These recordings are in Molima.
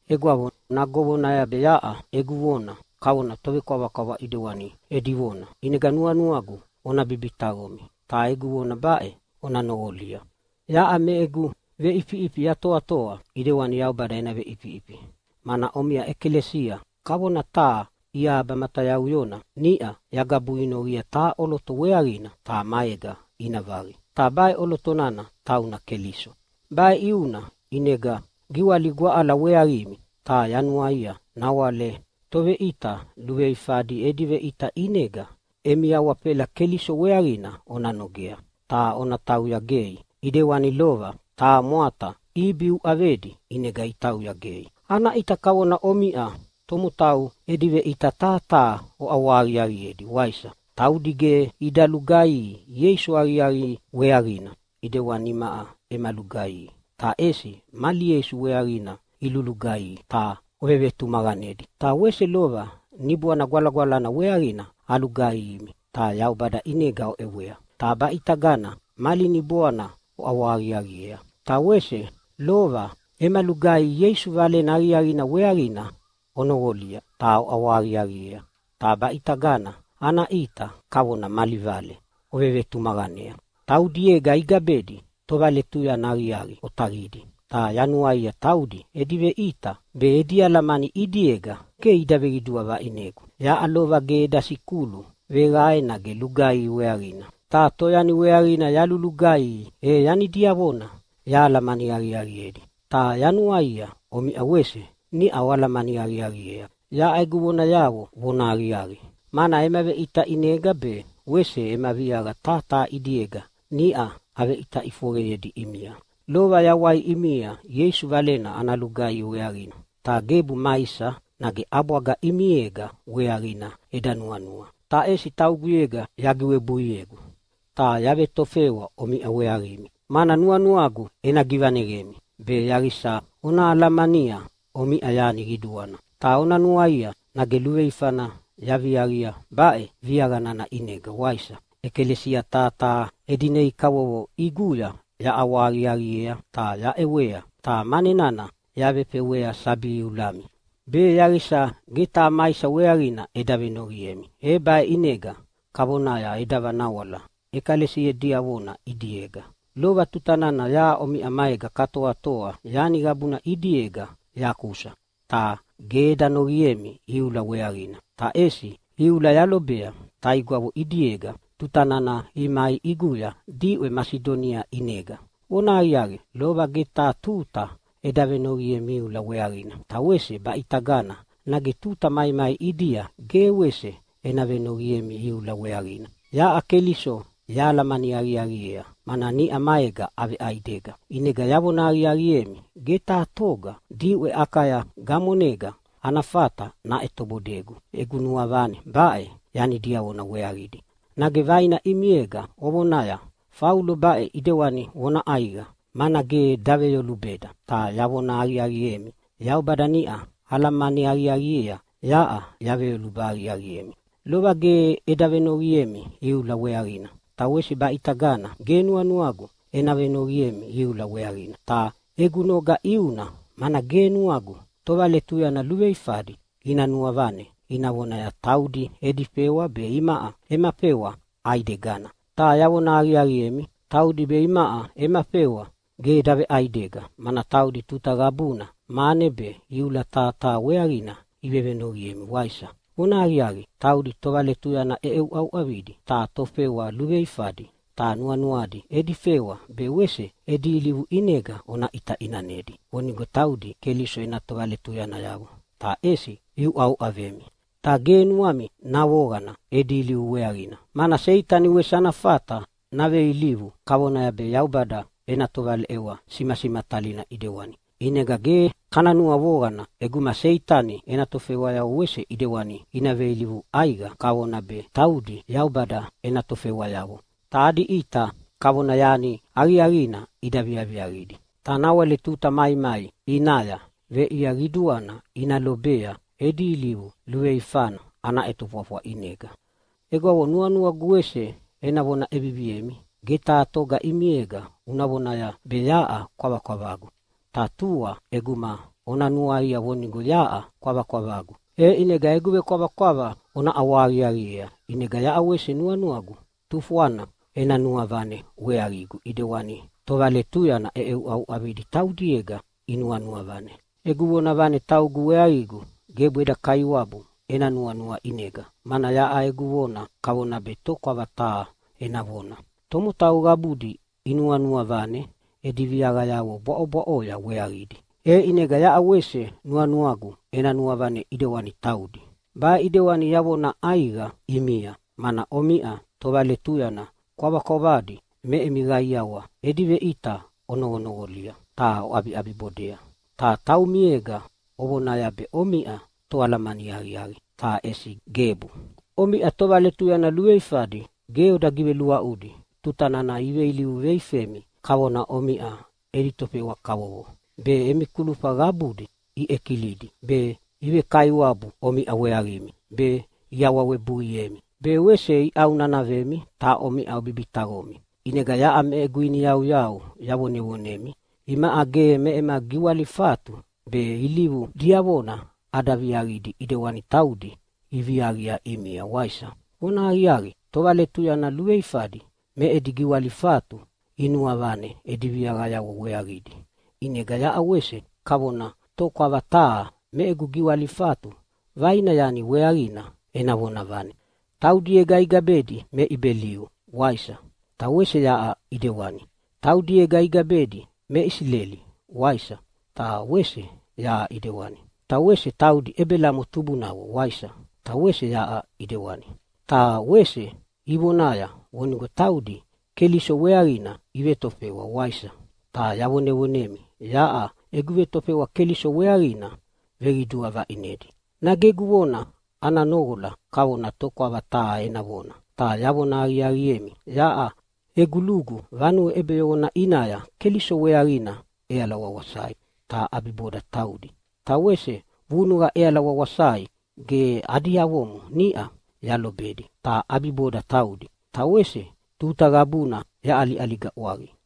Egwavo, nage ovonaya be yaʼa egu vona kavona be tovekwavakwava edi vona. ʼInega nuanuagu ona bibitaqomi, ta egu vona baʼe ona noqolia. Yaʼa me egu veʼifiʼifi yatoatoa ʼidewani Yaubada ena veʼifiʼifi, mana omiʼa ʼekalesia kavona taha iaba matayauyona niʼa yagabuinoqia taha ʼoloto weaqina ta maega ina vaqi, ta baʼe ʼoloto nana tauna Keliso. Baʼe ʼiuna ʼinega giwaligu aʼala weaqimi, ta yanuaia nawale toveʼita luveifadi edi veʼita ʼinega emi awafela Keliso weaqina ona nogea, ta ona tauya gei ʼidewani lova taha mwata Ibi uʼavedi ʼinega itauya gei. Ana ʼita kavona omiʼa tomotau edi veʼita taha taha oʼawahaqiaqiedi, waisa? Taudi ge ida lugaihi Ieisu aqiaqi weaqina ʼidewani imaʼa ema lugaihi, ta ʼesi mali Ieisu weaqina ilulugaihi ta ovevetumaqanedi. Ta wese lova Niboana Gwalagwalana weaqina alugaihimi ta Yaubada ʼinega oʼewea. Ta baʼitagana mali niboana oʼawahaqiaqiea. Ta wese lova ema lugaihi Ieisu Valena Aqiaqina weaqina onoqolia ta oʼawahaqiaqiea, ta baʼitagana ana ʼita kavona mali vale ovevetumaqanea. Taudiega igabedi tovaletuyana aqiaqi otaqidi, ta yanuaia taudi edi veʼita be edi alamani ʼidiega ge ida veqidua vaʼinegu. Yaʼa lova ge eda sikulu veqae nage lugaihi weaqina, ta toyani weaqina yalulugaihi, e yani diavona yahalamani aqiaqiedi. Ta yanuaia omiʼa wese niʼa oalamani aqiaqiea yaʼa egu vonayavo vonahaqiaqi, mana ema veʼita ʼinega be wese ema viaqa taha taha ʼidiega niʼa aveʼita ʼifoqeyedi ʼimia. Lova yawai ʼimia Ieisu Valena ana lugaihi weaqina, ta gebu maisa nage ʼabwaga ʼimiega weaqina eda nuanua. Ta ʼesi tauguyega yagiwebuiegu ta yavetofewa omiʼa weaqimi, mana nuanuagu ena givaneqemi be yaqisa ona alamania omiʼa yani qiduana. Ta ona nuaia nage luveifana yaviaqia baʼe viaqa nana ʼinega, waisa? ʼEkalesia taha taha edi nei kavovo ʼiguya yaʼawahaqiaqiea ta yaʼewea, ta mane nana yavefewea sabi iulami be yaqisa ge taha maisa weaqina eda venoqiemi. E baʼe ʼinega kavonaya eda vanawala ʼekalesia diavona ʼidiega. Lova tuta nana yaʼa omiʼa maega katoatoa yani qabuna ʼidiega yakusa, ta ge eda noqiemi iula weaqina. Ta ʼesi iula yalobea taigwavo ʼidiega tuta nana imai ʼiguya diʼwe Masidonia ʼinega. Vonahaqiaqi, lova ge taha tuta eda venoqiemi iula weaqina, ta wese baʼitagana nage tuta maimai ʼidia ge wese ena venoqiemi iula weaqina. Yaʼa Keliso yahalamani aqiaqiea, mana niʼa maega aveʼaidega. ʼInega yavona aqiaqiemi, ge taha toga diʼwe Akaya gamonega ana fata naʼetobodegu egu nuavane baʼe yani diavona weaqidi. Nage vaina ʼimiega ovonaya, “Faulo baʼe ʼidewani vona ʼaiqa, mana ge daveyolubeda!” Ta yavona aqiaqiemi, Yaubada niʼa alamani aqiaqiea yaʼa yaveveyoluba aqiaqiemi! Lova ge eda venoqiemi iula weaqina ta wese baʼitagana ge nuanuagu ena venoqiemi iula weaqina. Ta egu noga ʼiuna mana ge nuagu tovaletuyana luveifadi ina nuavane ina vonaya taudi edi fewa be imaʼa ema fewa ʼaidegana. Ta yavona aqiaqiemi taudi be imaʼa ema fewa ge daveʼaidega, mana taudi tuta qabuna mane be iula taha taha weaqina ivevenoqiemi, waisa? Vonahaqiaqi, taudi tovaletuyana ʼeuʼauʼavidi ta tofewa luveifadi! Ta nuanuadi edi fewa be wese edi ilivu ʼinega ona ʼita ʼinanedi vonigo taudi Keliso ena tovaletuyanayavo. Ta ʼesi iuʼauʼavemi. Ta ge nuami navoqana edi ilivu weaqina, mana Seitani wese ana fata naveilivu kavonaya be Yaubada ena tovaleʼewa simasimatalina ʼidewani. ʼInega ge kana nuavoqana ʼeguma Seitani ena tofewayavo wese ʼidewani ina veilivu ʼaiqa kavonaya be taudi Yaubada ena tofewayavo, ta adi ʼita kavona yani aqiaqina ida viaviaqidi. Ta nawale tuta maimai ʼinaya veʼia qiduana ina lobea edi ilivu luveifana ana ʼetofwafwa ʼinega. Egwavo, nuanuagu wese ena vona ʼeviviemi, ge taha toga ʼimiega una vonaya be yaʼa kwavakwavagu. Ta tua ʼeguma ona nuaia vonigo yaʼa kwavakwavagu, e ʼinega egu vekwavakwava ona ʼawahaqiaqiea, ʼinega yaʼa wese nuanuagu tufwana ena nuavane weaqigu ʼidewani tovaletuyana ʼeʼeuʼauʼavidi taudiega inuanua vane. Egu vonavane taugu weaqigu gebu eda Kaiwabu ena nuanua ʼinega, mana yaʼa egu vona kavona be tokwava taha ena vona. Tomotau qabudi inuanua vane edi viaqayavo bwaʼobwaʼoya weaqidi, e ʼinega yaʼa wese nuanuagu ena nuavane ʼidewani taudi. Baʼe ʼidewani yavona ʼaiqa ʼimia, mana omiʼa tovaletuyana kwavakwavadi me emi qaiawa edi veʼita onoqonoqolia ta oʼabiʼabibodea, ta taumiega ovonaya be omiʼa toalamani aqiaqi, ta ʼesi gebu! Omiʼa tovaletuyana luveifadi ge oda giveluaʼudi tuta nana iveilivu veifemi kavona omiʼa edi tofewa kavovo be, emi kulufa qabudi iʼekilidi be, ivekaiwabu omiʼa weaqimi be, iawawebuiemi be wese iʼaunanavemi, ta omiʼa obibitaqomi. ʼInega yaʼa me egu iniyauyau yavonevonemi imaʼa ge me ema giwalifatu be ilivu diavona ada viaqidi ʼidewani taudi iviaqia ʼimia, waisa? Vonahaqiaqi, tovaletuyana luveifadi me edi giwalifatu inuavane edi viaqayavo weaqidi, ʼinega yaʼa wese kavona tokwava taha me egu giwalifatu vaina yani weaqina ena vonavane. Taudiega igabedi me Ibeliu, waisa? Ta wese yaʼa ʼidewani. Taudiega igabedi me Isileli, waisa? Ta wese yaʼa ʼidewani. Ta wese taudi Ebelamo tubunavo, waisa? Ta wese yaʼa ʼidewani. Ta wese ivonaya vonigo taudi Keliso weaqina ivetofewa, waisa? Ta yavonevonemi yaʼa egu vetofewa Keliso weaqina veqidua vaʼinedi. Nage egu vona ana noqola kavona tokwava taha ena vona, ta yavona aqiaqiemi, yaʼa egu lugu vanue ʼebeyoqona ʼinaya Keliso weaqina ʼeala wawasai, ta ʼabiboda taudi. Ta wese vunuqa ʼeala wawasai ge adi avomo niʼa yalobedi, ta ʼabiboda taudi. Ta wese tuta qabuna yaʼaliʼaliga ʼwaqi.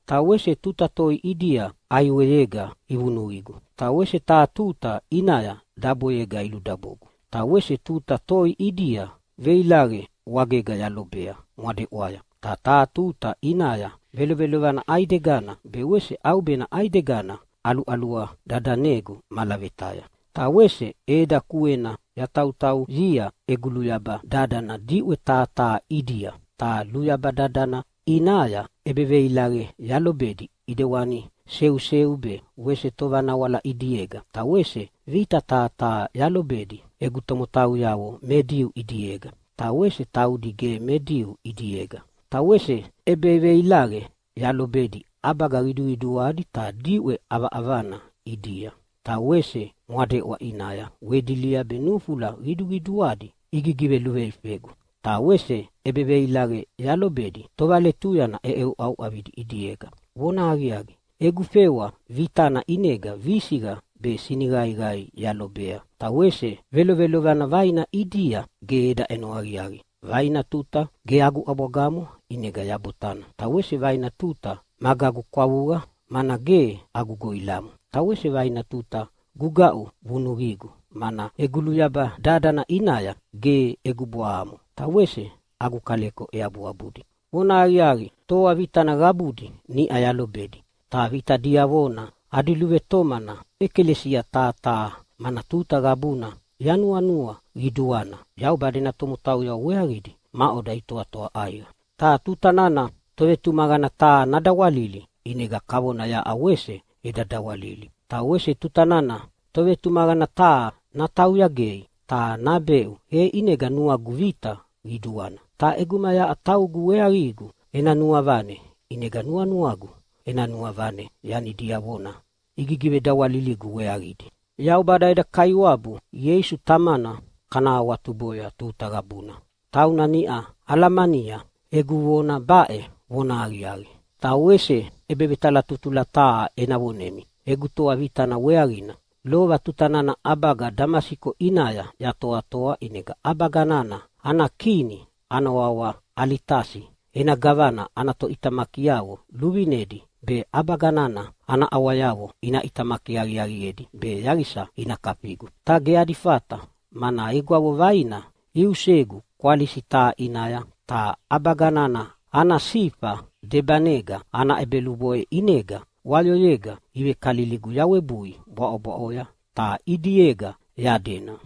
Ta wese tuta toi ʼidia ʼaiweyega ivunuqigu. Ta wese taha tuta ʼinaya daboyega iludabogu. Ta wese tuta toi ʼidia veilaqe wagega yalobea mwadeʼwaya. Ta taha tuta ʼinaya velovana ʼaidegana be wese ʼaubena ʼaidegana ʼaluʼalua dadanegu malavetaya. Ta wese ʼeda kuena yatautauyia egu luyaba dadana diʼwe taha taha ʼidia. Ta luyaba nana ʼinaya ʼebeveilaqe yalobedi ʼidewani seuseu be wese tovanawala ʼidiega. Ta wese vita taha taha yalobedi egu tomotauyavo me Diu ʼidiega, ta wese taudi ge me Diu ʼidiega. Ta wese ʼebeveilaqe yalobedi ʼabaga qiduqiduadi ta diʼwe ʼavaʼavana ʼidia, ta wese mwadeʼwa ʼinaya wedilia be nufula qiduqiduadi igiveluveifegu. Ta wese ʼebeveilaqe yalobedi tovaletuyana ʼeuʼauʼavidi ʼidiega. Vonahaqiaqi, egu fewa vitana ʼinega visiqa be siniqaiqai yalobea, ta wese velovelovana vaina ʼidia ge eda ʼeno aqiaqi. Vaina tuta ge agu ʼabwagamo ʼinega yabotana, ta wese vaina tuta magagu kwavuqa mana ge agu goʼilamo. Ta wese vaina tuta gugaʼu vunuqigu, mana egu luyaba dadana ʼinaya ge egu bwahamo ta wese agu kaleko eabuabudi. Vonahaqiaqi, toa vitana qabudi niʼa yalobedi, ta vita diavona adi luvetomana ʼekalesia taha taha, mana tuta qabuna yanuanua qiduana Yaubada ena tomotauyavo weaqidi maʼoda itoatoa ʼaiqa. Ta tuta nana tovetumaqana taha nadawalili, ʼinega kavona yaʼa wese eda dawalili. Ta wese tuta nana tovetumaqana taha natauya gei ta nabeʼu, e ʼinega nuagu vita qiduana. Ta ʼeguma yaʼa taugu weaqigu ena nuavane, ʼinega nuanuagu ena nuavane yani diavona igigivedawaliligu weaqidi. Yaubada eda Kaiwabu Ieisu Tamana kana awatuboya tuta qabuna. Tauna niʼa alamania egu vona baʼe vonahaqiaqi. Ta wese ʼebevetalatutula taha ena vonemi egu toa vitana weaqina. Lova tuta nana ʼabaga Damasiko ʼinaya yatoatoa ʼinega ʼabaga nana ana kini ana wawa Alitasi ena gavana ana toʼitamakiavo luvinedi be ʼabaga nana ana ʼawayavo ina ʼitamaki aqiaqiedi be yaqisa ina kafigu. Ta ge adi fata, mana egwavo vaina iusegu kwalisi taha ʼinaya ta ʼabaga nana ana sifa debanega ana ʼebeluboʼe ʼinega wayoyega ivekaliligu yawebui bwaʼobwaʼoya ta ʼidiega yadena.